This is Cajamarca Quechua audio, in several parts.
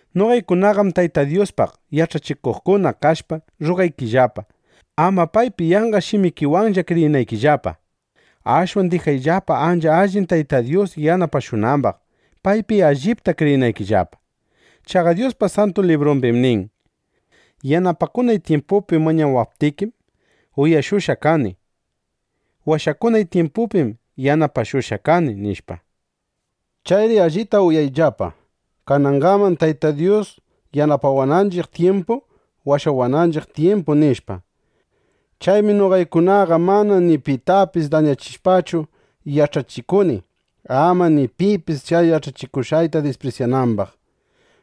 Noqaykunaqam Tayta Dyuspaq yach'achikuqkuna kashpa rrugaykillapa, ama paypi yanqa shimikiwanlla kriyinaykillapa. Ashwan dijayllapa, ancha allin Tayta Dyus yanapashunambaq, paypi allipta kriyinaykillapa. Chaqa Dyuspa Santu Librumbim nin: Yanapakunay tyimpupi mañawaptikim, uyashushqa kani. Washakunay tyimpupim yanapashushqa kani, nishpa. Chayri allita uyawayllapa: ¡Kananqam Tayta Dyus yanapawananchiq tyimpu, washawananchiq tyimpu! nishpa. Chaymi noqaykunaqa mana ni pitapis dañachishpachu yach'achikuni, ama ni pipis chay yach'achikushqayta disprisyanambaq.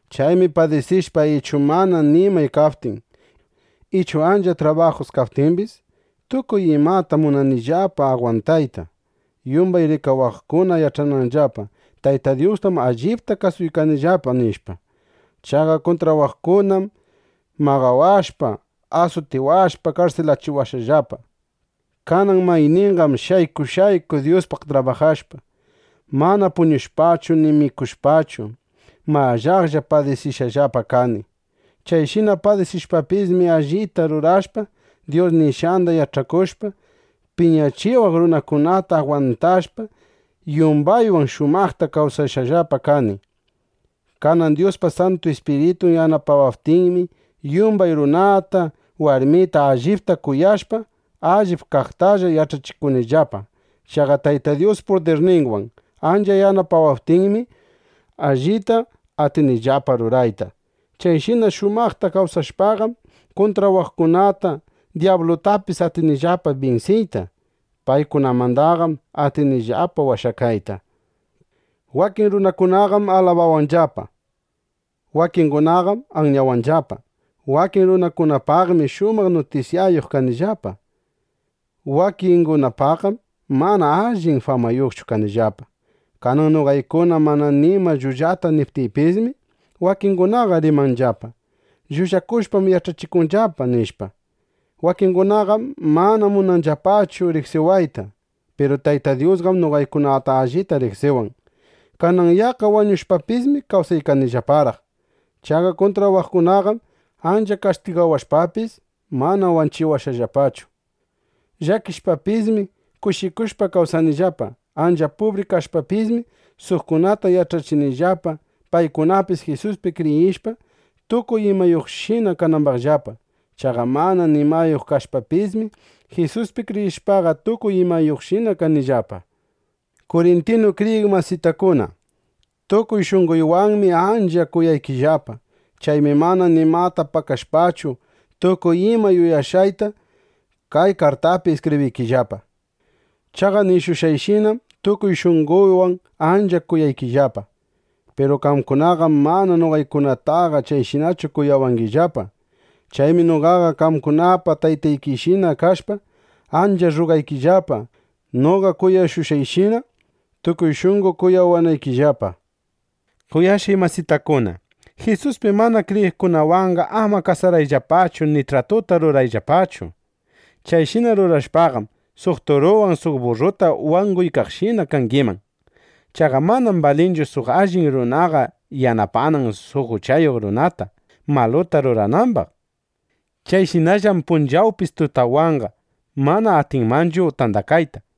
Chaymi padisishpa, ichu mana nimay kaptin, ichu ancha trabajus kaptimbis, tukuy imata munanillapa agwantayta, yumbay rikawaqkuna yach'ananllapa: Tayta Dyustam allipta kasuykanllapa, nishpa. Chaqa kuntrawaqkunam maqawashpa, asutiwashpa, karsilawashqallapa. Kanan mayninqam shayku shayku Dyuspaq trabajashpa, mana puñushpachu ni mikushpachu, mallaqlla padisishqallapa kani. Chayshina padisishpapismi, allita rurashpa, Dyus nishqanda yach'akushpa, piñachiwaq runakunata agwantashpa, yumbaywan shumaqta kawsashqallapa kani. Kanan Dyuspa Santu Ispiritun yanapawaptinmi, yumbay runata, warmita allipta kuyashpa, allip kaqtalla yach'achikunillapa. Chaqa Tayta Dyus pudirninwan ancha yanapawaptinmi, allita atinillapa rurayta. Chayshina shumaqta kawsashpaqam, kuntrawaqkunata, dyablutapis atinillapa binsiyta. Paykunamandaqam atinillapa washakayta. Wakin runakunaqam alabawanllapa. Wakingunaqam anyawanllapa. Wakin runakunapaqmi shumaq nutisyayuq kanillapa. Wakingunapaqqam mana allin famayuqchu kanillapa. Kanan noqaykuna mana nima llullata niptiypismi, wakingunaqa rimanllapa: “Llullakushpam yach'achikunllapa”, nishpa. Wakingunaqam mana munanllapachu riqsiwayta. Piru Tayta Dyusqam noqaykunata allita riqsiwan. Kanan yaqqa wañushpapismi kawsaykanillaparaq. Chaqa kuntrawaqkunaqam ancha kastigawashpapis, mana wanchiwashqallapachu. Llakishpapismi, kushikushpa kawsanillapa. Ancha pubri kashpapismi, suqkunata yach'achinillapa, paykunapis Jisuspi kriyishpa, tukuy imayuqshina kanambaqllapa. Chaqa mana nimayuq kashpapismi, Jisuspi kriyishpaqa, tukuy imayuqshina kanillapa. Kurintinu kriyiq masitakuna, tukuy shunqoywanmi ancha kuyaykillapa. Chaymi mana nimata pakashpachu, tukuy ima yuyashqayta kay kartaypi iskibriykillapa. Chaqa nishushqayshinám tukuy shunqoywan ancha kuyaykillapa. Piru qamkunaqam mana noqaykunataqa chayshinachu kuyawangillapa. Chaymi noqaqa qamkunapa taytaykishina kashpa, ancha rrugaykillapa, noqa kuyashushqayshina tukuy shunqo kuyawanaykillapa. Kuyashqay masitakuna, Jisuspi mana kriyiqkunawanqa ama kasarayllapachu ni tratuta rurayllapachu. (Chayshina rurashpaqam, suq turuwan suq burruta wanguykaqshina kangiman.) Chaqa manam balinchu suq allin runaqa yanapanan suq uchayuq runata, maluta ruranambaq. Chayshinallam punchawpis tutapwanqa mana atinmanchu tandakayta.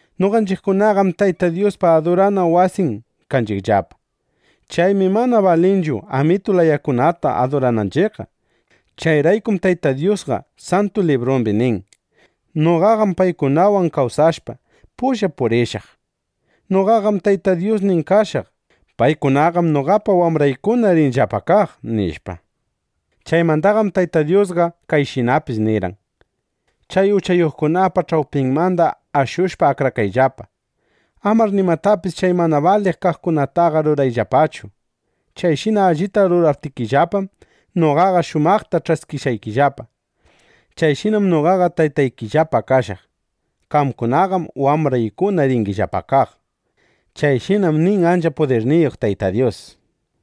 Noqanchiqkunaqam Tayta Dyuspa adurana wasin kanchiqllapa. Chaymi mana balinchu amitu layakunata adurananchiqqa. Chayraykum Tayta Dyusqa Santu Librumbi nin: Noqaqam paykunawan kawsashpa, pulla purishaq. Noqaqam Tayta Dyusnin kashaq. Paykunaqam noqapa wambraykuna rinllapa kaq, nishpa. Chaymandaqam Tayta Dyusqa kayshinapis nirqan: Chay uchayuqkunapa ch'awpinmanda ashushpa, akrakayllapa. Amar nimatapis chay mana baliq kaqkunataqa rurayllapachu. Chayshina allita ruraptikillapam, noqaqa shumaqta ch'askishqaykillapa. Chayshinam noqaqa Taytaykillapa kashaq. Qamkunaqam wambraykuna ringillapa kaq. Chayshinam nin ancha pudirniyuq Tayta Dyus.